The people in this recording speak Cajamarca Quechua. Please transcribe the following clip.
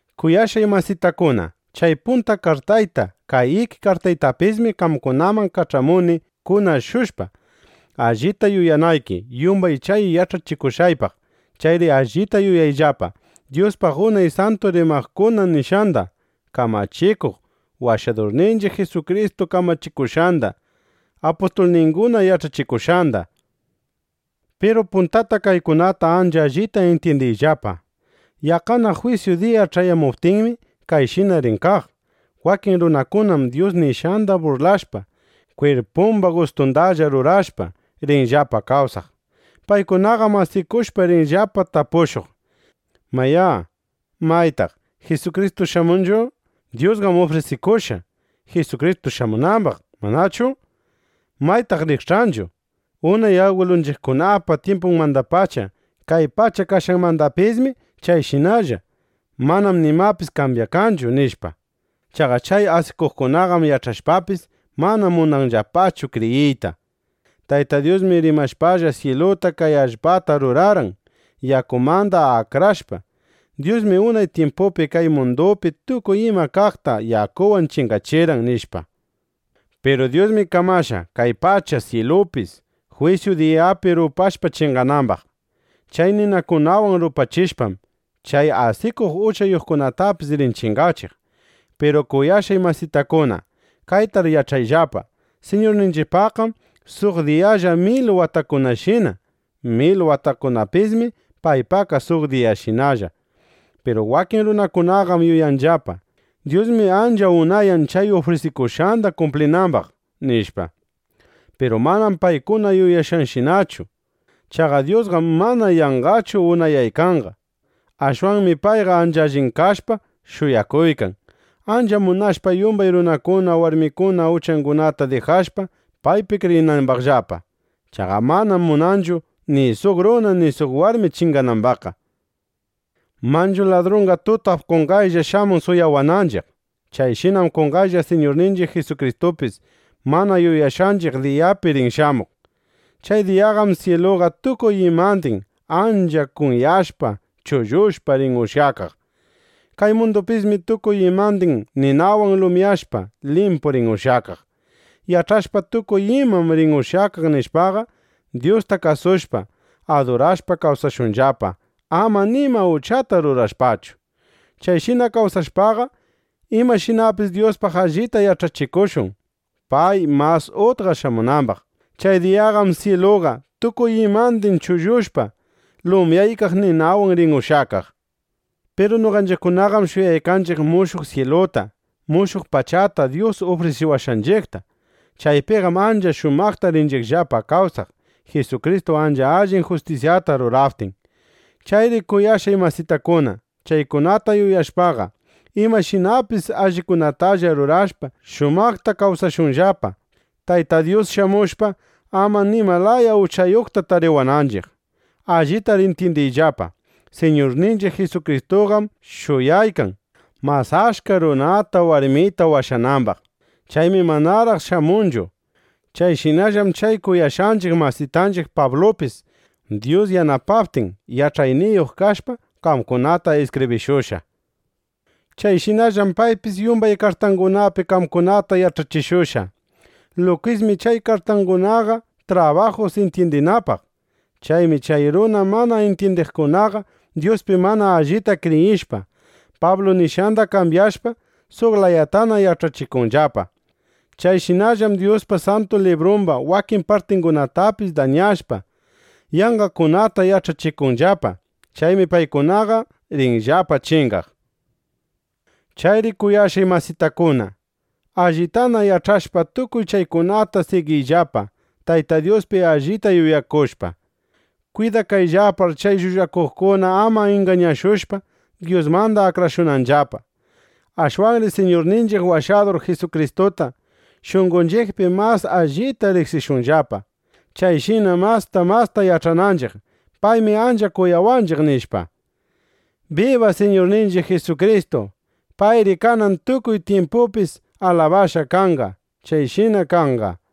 Kuyashqay masitakuna, chay punta kartayta, kay iki kartaytapismi qamkunaman kach'amuni kunashushpa, allita yuyanayki yumbay chay yach'achishushqaypaq. Chayri allita yuyayllapa Dyuspaq unay santu rimaqkuna nishqanda, Kamachikuq Washadurninchiq Jisukristu kamachikushqanda, apustulninguna yach'achishushqanda. Piru puntata kaykuna ancha allita intyindiyllapa: Yaqqana jwisyu diya ch'ayamuptinmi, kayshina rin kaq. Wakin runakunam Dyus nishqanda burlashpa, kwirpumba gustundalla rurashpa, rinllapa kawsaq. Paykunaqam asikushpa rinllapa tapushuq: “Mayá, ¿maytaq Jisukristu shamunchu? Dyusqam ufrisikushqa, Jisukristu shamurinambaq, ¿manachu? ¿Maytaq rikch'anchu? Unay agwilunchiqkunapa tyimpunmandapacha, kay pacha kashqanmandapismi chayshinalla. Manam nimapis kambyakanchu”, nishpa. Chaqa chay asikuqkunaqam yach'ashpapis, mana munanllapachu kriyiyta: Tayta Dyusmi rimashpalla, syiluta, kay allpata rurarqan, yakumanda akrashpa. Dyusmi unay tyimpupi kay mundupi tukuy ima kaqta yakuwan chingachirqan, nishpa. Piru Dyusmi kamashqa, kay pacha, syilupis, jwisyu diyapi rupashpa chinganambaq. Chay ninakunawan rupachishpam, chay asikuq uchayuqkunatapis rin chingachiq. Piru kuyashqay masitakuna, kaytar yach'ayllapa: Siñurninchiqpaqqam suq diyalla mil watakunashina. Mil watakunapismi paypaqqa suq diyashinalla. Piru wakin runakunaqam yuyanllapa: Dyusmi ancha unayan chay ufrisikushqanda kumplinambaq, nishpa. Piru manam paykuna yuyashqanshinachu. Chaqa Dyusqam mana yanqachu unayaykanqa. Ashwanmi payqa ancha allin kashpa shuyakuykan, ancha munashpa yumbay runakuna, warmikuna uchangunata dijashpa, paypi kriyinambaqllapa. Chaqa manam munanchu, ni suq runa, ni suq warmi chinganambaqqa. Manchu ladrunqa tutap qonqaylla shamun suwawananchiq. Chayshinam qonqaylla Siñurninchiq Jisukristupis mana yuyashqanchiq diyapi rin shamuq. Chay diyaqam syiluqa tukuy imandin ancha kunyashpa chullushpa rin ushyakaq. Kay mundupismi tukuy imandin ninawan lumyashpa, limpu rin ushyakaq. Yach'ashpa: Tukuy imam rin ushyakaq, nishpaqa, Dyusta kasushpa, adurashpa kawsashunllapa, ama nima uchata rurashpachu. Chayshina kawsashpaqa, imashinapis Dyuspaq allita yach'achikushun, pay mas utqa shamunambaq. Chay diyaqam syiluqa tukuy imandin chullushpa lumyaykaq ninakunawan rin ushyakaq. Piru noqanchiqkunaqam shuyaykanchiq mushuq syiluta, mushuq pachata Dyus ufrisiwashqanchiqta. Chaypiqam ancha shumaqta rinchiqllapa kawsaq, Jisukristu ancha allin justisyata ruraptin. Chayri kuyashqay masitakuna, chaykunata shuyashpaqa, imashinapis allikunatalla rurashpa, shumaqta kawsashunllapa, Tayta Dyus shamushpa, ama nima laya uchayuqta tariwananchiq. Allitar intyindiyllapa, Siñurninchiq Jisukristuqam shuyaykan, mas achka runata warmita washanambaq. Chaymi manaraq shamunchu. Chayshinallam chay kuyashqanchiq masitanchiq Pablupis, Dyus yanapaptin, yach'ayniyuq kashpa, qamkunata iskibrishushqa. Chayshinallam paypis yumbay kartangunapi qamkunata yach'achishushqa. Lukismi chay kartangunaqa trabajus intyindinapaq. Chaymi chay runa mana intyindiqkunaqa, Dyuspi mana allita kriyishpa, Pablu nishqanda kambyashpa, suq layatana yach'achikunllapa. Chayshinallam Dyuspa Santu Librumba wakin partingunatapis dañashpa, yanqakunata yach'achikunllapa. Chaymi paykunaqa rinllapa chingaq. Chayri kuyashqay masitakuna, allitana yach'ashpa tukuy chaykunata, sigiyllapa Tayta Dyuspi allita yuyakushpa. Kwidakayllapar, chay llullakuqkuna ama ingañashushpa, Dyusmanda akrashunanllapa. Ashwanri Siñurninchiq Washadur Jisukristuta shunqonchiqpi mas allita riqsishunllapa, chayshina masta masta yach'ananchiq: Paymi ancha kuyawanchiq, nishpa. ¡Biba Siñurninchiq Jisukristu! ¡Payri kanan tukuy tyimpupis alabashqa kanqa! Chayshina kanqa.